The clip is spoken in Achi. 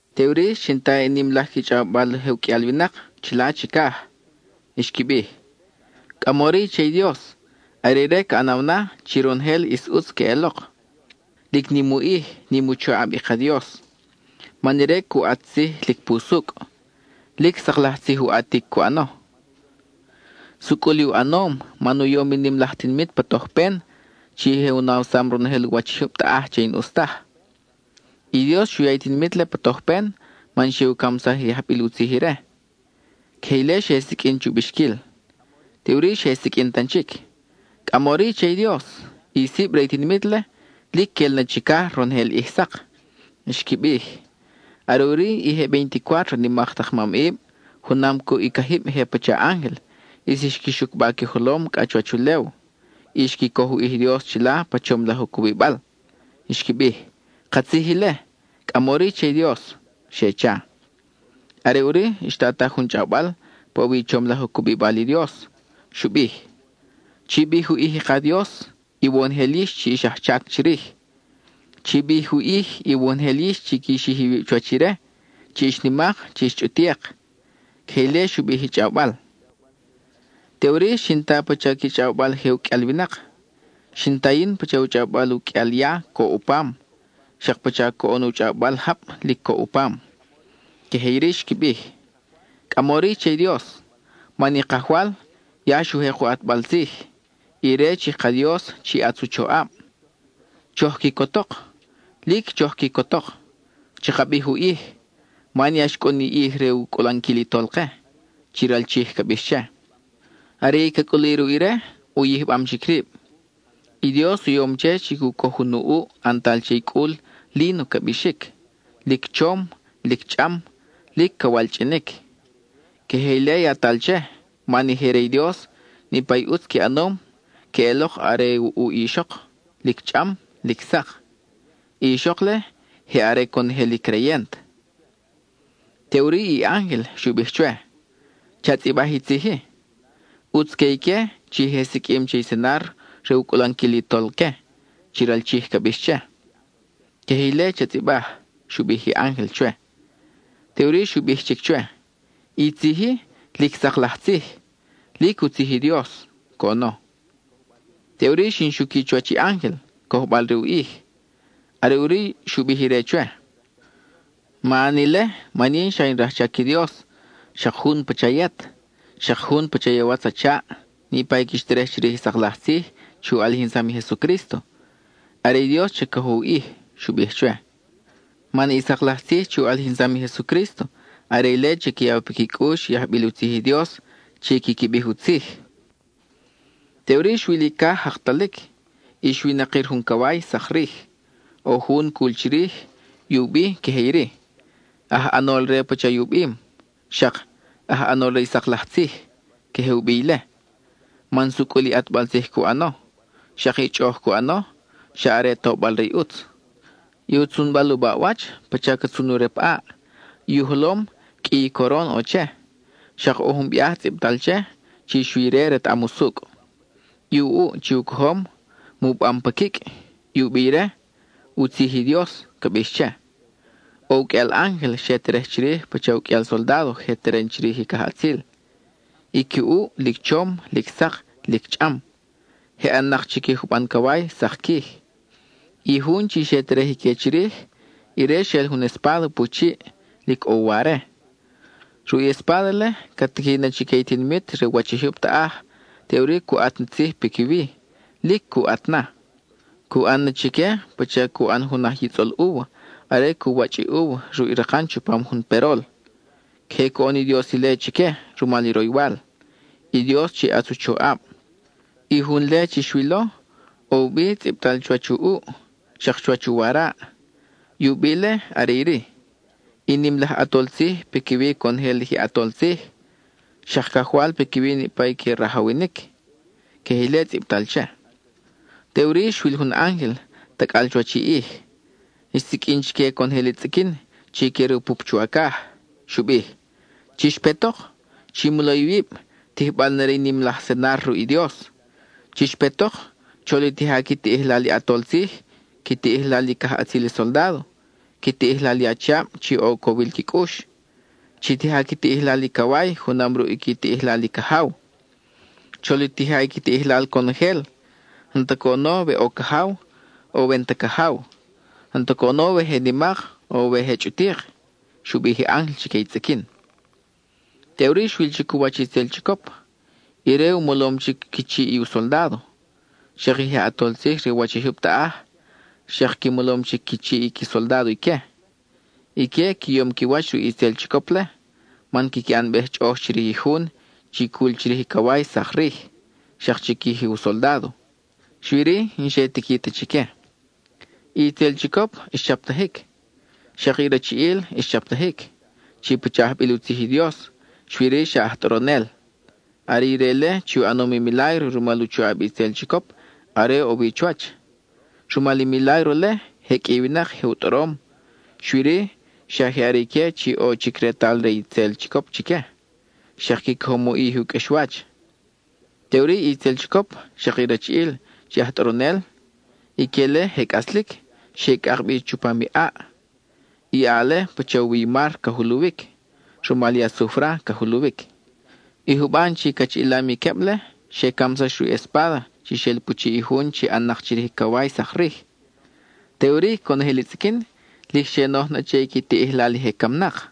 Teʼuri xin ta i nim laj qui chʼawbal je u qʼuial winak chila chicaj; xqui bij: ¡Cʼamori che i Dios! ¡Are ire ca ʼanaw na chi ronojel ʼis ʼutz queʼelok! ¡Lic nim u ʼij, nim u choʼab i ka Dios! Man ire cu ʼat tzij lic pusucʼ; lic sak laj tzij u ʼatic cu ʼano. Sucʼul i u ʼanom, man u yom i nim laj tinimit pa tojpen, chi xe u nawsaj ronojel u wach i jyub taʼaj che i n-ʼus taj. I Dios xu ya i tinimit-le pa tojpen man xe u camsaj i je ajbil u tzij ire. Queje ile xe siqʼuin chu bixquil. Teʼuri xe siqʼuin tan chic: —¡Cʼamori che i Dios! ¡I sib re i tinimit-le lic quel na chicaj ronojel ʼij sak! —xqui bij. Are ʼuri i je veinticuátro nimak tak mamʼib, junam cuʼ i cajib je pacha ángel, ʼis xqui xucba qui jolom cʼa chuwach ulew, y xqui coj u ʼij i Dios chila pa chom laj u cubibal. Xqui bij: —¡Katzij ile! ¡Cʼamori che i Dios! —xe cha. Are ʼuri, xtataj jun chʼawbal pa ʼo wi i chom laj u cubibal i Dios; xu bij: Chi bij u ʼij i ka Dios, iwonojel yix chi ix ajchac chirij. Chi bij u ʼij, iwonojel yix chi qui xij iwib chuwach ire, chi ix nimak, chi ix chʼutik. (Queje ile xu bij i chʼawbal.) Teʼuri xin ta pacha qui chʼawbal je u qʼuial winak; xin ta yin pacha u chʼawbal u qʼuial ya, coʼ u pam, xak pacha coʼon u chʼawbal jab lic coʼ u pam. Queje iri xqui bij: ¡Cʼamori che i Dios, man i Kajwal ya xu jek u ʼatbal tzij, ire chi ka Dios chi ʼatz u choʼab! ¡Choj quicotok! ¡Lic choj quicotok! ¡Chaka bij u ʼij, man ya xcʼun i ʼij re u cʼulanquil i Tolke, chi ral Chij ca bix che! Are i ca cʼuli ruʼ ire, u yijbam chic rib; I Dios u yom che chi cu coj jun u ʼuʼ ʼantal che i cʼul líno ca bixic. Lic chom, lic chʼam, lic ca walchʼinic. Queje ile yatal che, man i je re i Dios, niʼpa i ʼutz qui ʼanom queʼelok are u ʼuʼ i ixok, lic chʼam, lic sak. (I ixok-le, je are conojel i creyent.) Teʼuri i ángel xu bij chwe: —Cha tzʼibaj i tzij-i: “ʼUtz que ique chi je siqʼuim che i cenar re u cʼulanquil i Tolque,” chi ral Chij ca bix che. Queje ile cha tzʼibaj —xu bij i ángel chwe. Teʼuri xu bij chic chwe: —I tzij-i, lic sak laj tzij, lic u tzij i Dios —coʼono. Teʼuri xin xuqui chuwach i ángel, cojbal re u ʼij; are ʼuri xu bij ire chwe: —Ma ʼan ile, man yin xa in rajchac i Dios, xak jun pacha yet, xak jun pacha i awatz a chaʼ, niʼpa i quix terej chirij i sak laj tzij chi u ʼalijinsam i Jesucrísto. Are i Dios cha cojo u ʼij —xu bij chwe. Man i sak laj tzij chi u ʼalijinsam i Jesucrísto, are ile chi ca yaw piqui cʼux i ajbil u tzij i Dios chi quiqui bij u tzij. Teʼuri xwil i caj jakalic, y xwinakir jun caway, sak rij. ʼO jun cul chirij, i u bi queje iri: “Aj ʼanol re pacha i u bim,” xak “Aj ʼanol re i sak laj tzij.” Queje u bi ile, man sucʼul i ʼatbal tzij cu ʼano; xak i chʼoʼoj cu ʼano, xa are tobal re i ʼutz. I u tzunbal u baʼwach, pacha ca tzun u rep ʼaʼ; i u jolom, qʼui i coron ʼo che. Xak ʼo jun biaj tzʼibtal che, chi xui ire retaʼam usucʼ. I u ʼuʼ chi u cojom, mubam pa quicʼ. I u bi ire, “U Tzij i Dios” ca bix che. ʼO u qʼuial ángel xe terej chirij pacha u qʼuial soldádo je teren chirij i cajʼatzil. I qui ʼuʼ, lic chom, lic sak, lic chʼam. Je ʼan-nak chiquij juban caway sak quij. I jun chi xe terej ique chirij, ire xel jun espáda pu chiʼ, lic ʼo u ware. Ruʼ i espáda-le, ca tiqui na chique i tinimit re u wach i jyub taʼaj, teʼuri cu ʼat ni tzij piquiwi; lic cu ʼat na. Cu ʼan na chique pacha cu ʼan jun aj yitzʼol úva, are cu wachʼ i úva ruʼ i rakan chupam jun perol. Queje coʼon i Dios ile chique rumal i roywal, i Dios chi ʼatz u choʼab. I jun-le chi xwilo, ʼo u bi tzʼibtal chuwach u ʼuʼ, xak chuwach u waraʼ; i u bi-le are iri: “I nim laj ʼAtol Tzij piquiwi conojel i je ʼatol tzij, xak Cajwal piquiwi niʼpa i que rajawinic.” (Queje ile tzʼibtal che.) Teʼuri xwil jun ángel tacʼal chuwach i ʼij; xsiqʼuin chique conojel i tzʼiquin chi que rupup chuwacaj. Xu bij: —¡Chix petok! Chi molo iwib, tijbal na re i nim laj cenar ruʼ i Dios. Chix petok, chol i tija qui tiʼijlal i ʼatol tzij, qui tiʼijlal i cajʼatzil i soldádo, qui tiʼijlal i achiab chi ʼo u cowil qui cʼux. Chi tija qui tiʼijlal i caway junam ruʼ qui tiʼijlal i cajaw. Chol i tija qui tiʼijlal conojel, n-ta coʼono we ʼo cajaw, o we n-ta cajaw; n-ta coʼono we je nimak o we je chʼutik —xu bij i ángel chique i tzʼiquin. Teʼuri xwil chic u wach itzel chicop; ire u molom chic qui chiʼ i u soldádo. Xak i je ʼatol tzij re u wach i jyub taʼaj, xak qui molom chic qui chiʼ i qui soldádo ique. Ique qui yom qui wach ruʼ i itzel chicop-le, man quiqui ʼanbej chʼoʼoj chirij i jun chi cul chirij i caway sak rij, xak chiquij i u soldádo. (Xui-ri, n-xe tiqui ta chique.) I itzel chicop xchaptajic. Xak i rachiʼil xchaptajic, chi pacha ajbil u tzij i Dios, xui-ri xa aj tʼoronel. Are ire-le chi u ʼanom i milágro rumal u choʼab i itzel chicop are ʼo wi chuwach. Rumal i milágro-le, je qʼui i winak je u tʼorom, xui-ri xa je are ique chi ʼo chic retal re i itzel chicop chique, xak qui cojom u ʼij i u qʼuexwach. Teʼuri i itzel chicop, xak i rachiʼil chi aj tʼoronel, ique-le je cʼaslic xe cʼak bi chupam i ʼaʼ. I ʼaʼ-le pacha u wi i mar ca juluwic; rumal i asufra ca juluwic. I juban chi cachiʼilam i queb-le, xe camsax ruʼ i espáda chi xel pu chiʼ i jun chi ʼan-nak chirij i caway sak rij. Teʼuri conojel i tzʼiquin lic xe noj na che i qui tiʼijlal i je camnak.